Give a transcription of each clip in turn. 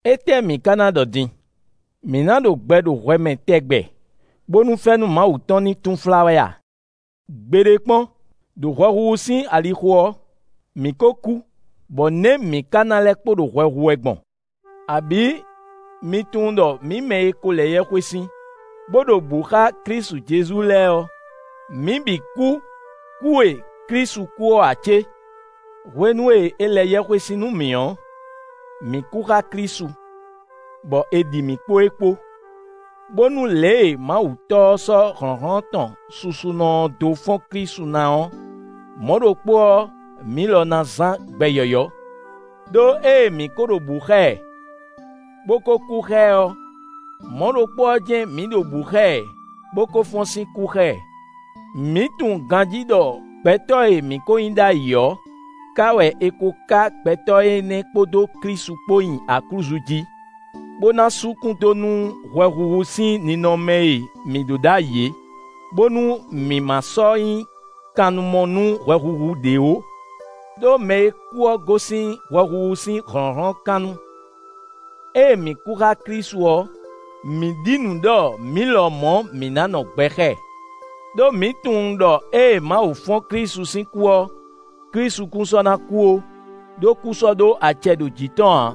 Étɛ́ mǐ ka ná ɖɔ din? Mǐ nǎ ɖo gbɛ ɖo hwɛ mɛ tɛgbɛ bónú fɛ́nú Mawu tɔn ní túnflá wɛ a? Gbeɖé kpɔ́n! Đo hwɛhuhu sín alixo ɔ́, mǐ kó kú; bɔ nɛ̌ mǐ ka ná lɛ́ kpo ɖo hwɛ hu wɛ gbɔn? Abǐ mi tunwun ɖɔ mǐ mɛ e ko lɛ yɛhwesin, bó ɖo bǔ xá Klísu Jezu lɛ́ɛ ɔ́, mǐ bǐ kú kú e Klísu kú ɔ́ ǎ cé? Hwenu e è lɛ yɛhwesin nú mǐ ɔ́, mǐ kú xá Klísu, bɔ è ɖi mǐ kpó e kpó, bónú lě e Mawu Tɔ́ ɔ́ sɔ́ hlɔ̌nhlɔ́n tɔn susunɔ ɔ́ dó fɔ́n Klísu ná ɔ́, mɔ̌ ɖokpó ɔ́, mǐ lɔ ná zán gbɛ yɔ̌yɔ́. Đó ée mǐ ko ɖo bǔ xá ɛ, bó ko kú xá ɛ ɔ́, mɔ̌ ɖokpó ɔ́ jɛ́n mǐ ɖo bǔ xá ɛ bó ko fɔ́n sín kú xá ɛ. Mǐ tunwun ganjí ɖɔ gbɛtɔ́ e mǐ ko nyí ɖ'ayǐ ɔ́, ká wɛ è ko ká gbɛtɔ́ énɛ́ kpódó Klísu kpó nyi aklúzu jí, bó ná sú kún dó nú hwɛhuhu sín ninɔmɛ e mǐ ɖó ɖ'ayǐ é, bónú mǐ ma sɔ́ nyí kannumɔ nú hwɛhuhu ɖě ó. Đó mɛ e kú ɔ́ gosín hwɛhuhu sín hlɔ̌nhlɔ́n kan nu. Ée mǐ kú xá Klísu ɔ́, mǐ ɖi nǔ ɖɔ mǐ lɔmɔ̌ mǐ ná nɔ gbɛ xá ɛ. Đó mǐ tunwun ɖɔ ée Mawu fɔ́n Klísu sín kú ɔ́, Klísu kún sɔ́ ná kú ó; ɖó kú sɔ́ ɖó acɛ ɖo jǐ tɔn ǎ.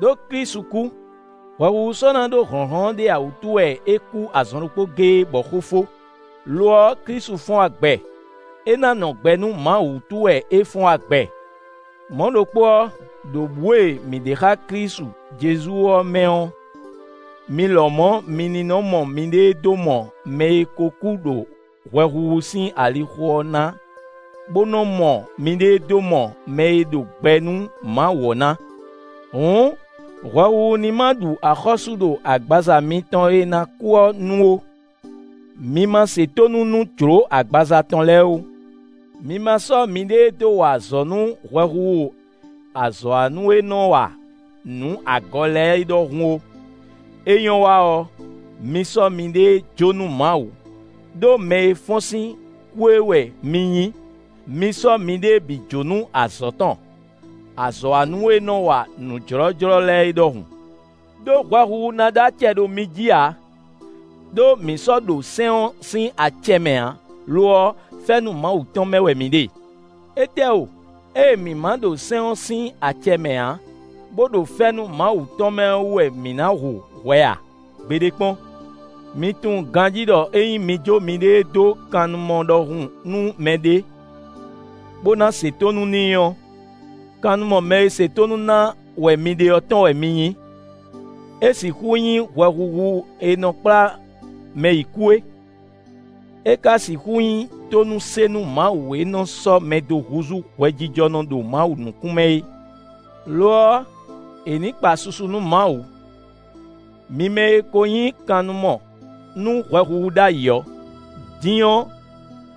Đó Klísu kú; hwɛhuhu sɔ́ ná ɖó hlɔ̌nhlɔ́n ɖé ǎ wútu wɛ é kú azɔn ɖokpó géé, bɔ xó fó. Lo ɔ́, Klísu fɔ́n wá gbɛ; é ná nɔ gbɛ nú Mawu wútu wɛ é fɔ́n wá gbɛ. Mɔ̌ ɖokpó ɔ́, ɖo bǔ e mǐ ɖe xá Klísu Jezu ɔ́ mɛ ɔ́, mi lɔmɔ̌ mi ní nɔ mɔ miɖée dó mɔ mɛ e ko kú ɖo hwɛhuhu sín alixo ɔ́ na bo nɔ mɔ miɖée dó mɔ mɛ e ɖo gbɛ nú Mawu ɔ́ ná. Hǔn, hwɛhuhu ní ma ɖu axɔ́sú ɖo agbaza mitɔn e ná kú ɔ́ nu ó; mi ma se tónú nú jló agbaza tɔn lɛ́ɛ ó. Mi ma sɔ́ miɖée dó wa azɔ̌ nú hwɛhuhu azɔ̌wanú e nɔ wa nǔ agɔ lɛ́ɛ é ɖɔhun ó; é nyɔ́ wa ɔ́, mi sɔ́ miɖée jó nú Mawu, ɖó mɛ e fɔ́n sín kú é wɛ mi nyí; mi sɔ́ miɖée bǐ jó nú azɔ̌ tɔn, azɔ̌wanú e nɔ wa nǔ jlɔ́jlɔ́ lɛ́ɛ é ɖɔhun. Đó hwɛhuhu ná ɖó acɛ ɖo mi jí ǎ; ɖó mi sɔ́ ɖo sɛ́n ɔ́ sín acɛ mɛ ǎ; lo ɔ́, fɛ́nú Mawu tɔn mɛ wɛ mi ɖe. Étɛ́ o! Ée mǐ ma ɖo sɛ́n ɔ́ sín acɛ mɛ ǎ, bó ɖo fɛ́nú Mawu tɔn mɛ ɔ́ wú wɛ mǐ ná hu hwɛ a? Gbeɖé kpɔ́n! Mi tunwun ganjí ɖɔ ényí mi jó miɖée dó kannumɔ ɖɔhun nú mɛɖé, bó ná se tónú n'i ɔ́, kannumɔ mɛ e se tónú ná wɛ mi ɖe ɔ́ tɔn wɛ mi nyí. É sixú nyí hwɛhuhu e nɔ kplá mɛ yi kú é; é ka sixú nyí tónúse nú Mawu e nɔ sɔ́ mɛ dó húzú hwɛjijɔnɔ ɖo Mawu nukún mɛ é. Lo ɔ́, è ní kpa susu nú Mawu! Mi mɛ e ko nyí kannumɔ nú hwɛhuhu ɖ'ayǐ ɔ́, din ɔ́,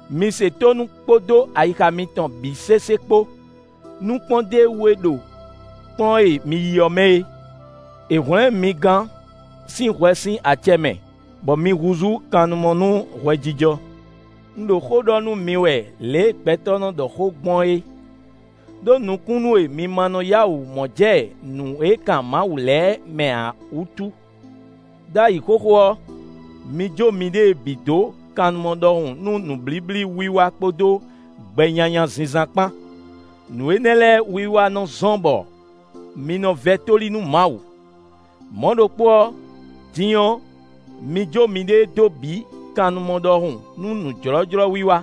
mi se tónú kpódó ayixa mitɔn bǐ sésé kpo nú kpɔ́ndéwú e ɖo kplɔ́n e mi yí ɔ́ mɛ é. È hwlɛ̌n mi gán sín hwɛ sín acɛ mɛ, bɔ mi húzú kannumɔ nú hwɛjijɔ. Un ɖo xó ɖɔ nú mi wɛ lě e gbɛtɔ́ nɔ ɖɔ xó gbɔn é, ɖó nukúnnú e mi ma nɔ yá wǔ mɔ jɛ nǔ e kan Mawu lɛ́ɛ mɛ ǎ wútu. Ɖ'ayǐ xóxó ɔ́, mi jó miɖée bǐ dó kannumɔ ɖɔhun nú nǔblíblí wiwa kpódó gbɛ nyanya zínzán kpán; nǔ énɛ́ lɛ́ɛ wiwa nɔ zɔ́n bɔ mi nɔ vɛ́ tóli nú Mawu. Mɔ̌ ɖokpó ɔ́, din ɔ́, mi jó miɖée dó bǐ kannumɔ ɖɔhun nú nǔjlɔ́jlɔ́wiwa;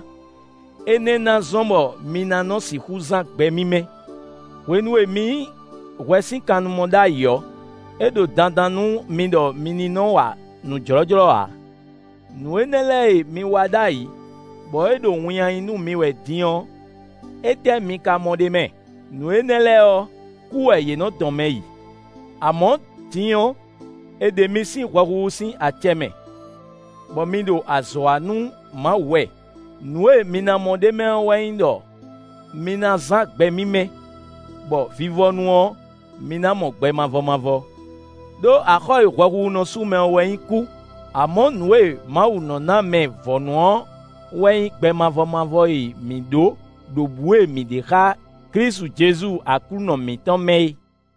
énɛ́ ná zɔ́n bɔ mi ná nɔ sixú zán gbɛ mímɛ́. Hwenu e mi nyí hwɛ sín kannumɔ ɖ'ayǐ ɔ́, é ɖo dandan nú mi ɖɔ mi ní nɔ wa nǔ jlɔ́jlɔ́ ǎ. Nǔ énɛ́ lɛ́ɛ e mi wa ɖ'ayǐ, bɔ é ɖo winnyá nyí nú mi wɛ din ɔ́, étɛ́ mi ka mɔ ɖ'é mɛ? Nǔ énɛ́ lɛ́ɛ ɔ́, kú wɛ yě nɔ dɔn mɛ yi. Amɔ̌, din ɔ́, è ɖe mi sín hwɛhuhu sín acɛ mɛ, bɔ mi ɖo azɔ̌ wa nú Mawu wɛ. Nǔ e mi ná mɔ ɖ'é mɛ ɔ́ wɛ nyí ɖɔ mi na zán gbɛ mímɛ́, bɔ vivɔnu ɔ́, mi ná mɔ gbɛ mavɔ mavɔ. Đó axɔ́ e hwɛhuhu nɔ sú mɛ ɔ́ wɛ nyí kú; amɔ̌ nǔ e Mawu nɔ ná mɛ vɔ̌nu ɔ́ wɛ nyí gbɛ mavɔ mavɔ e mǐ ɖó ɖo bǔ e mǐ ɖe xá Klísu Jezu Aklúnɔ mǐtɔn mɛ é.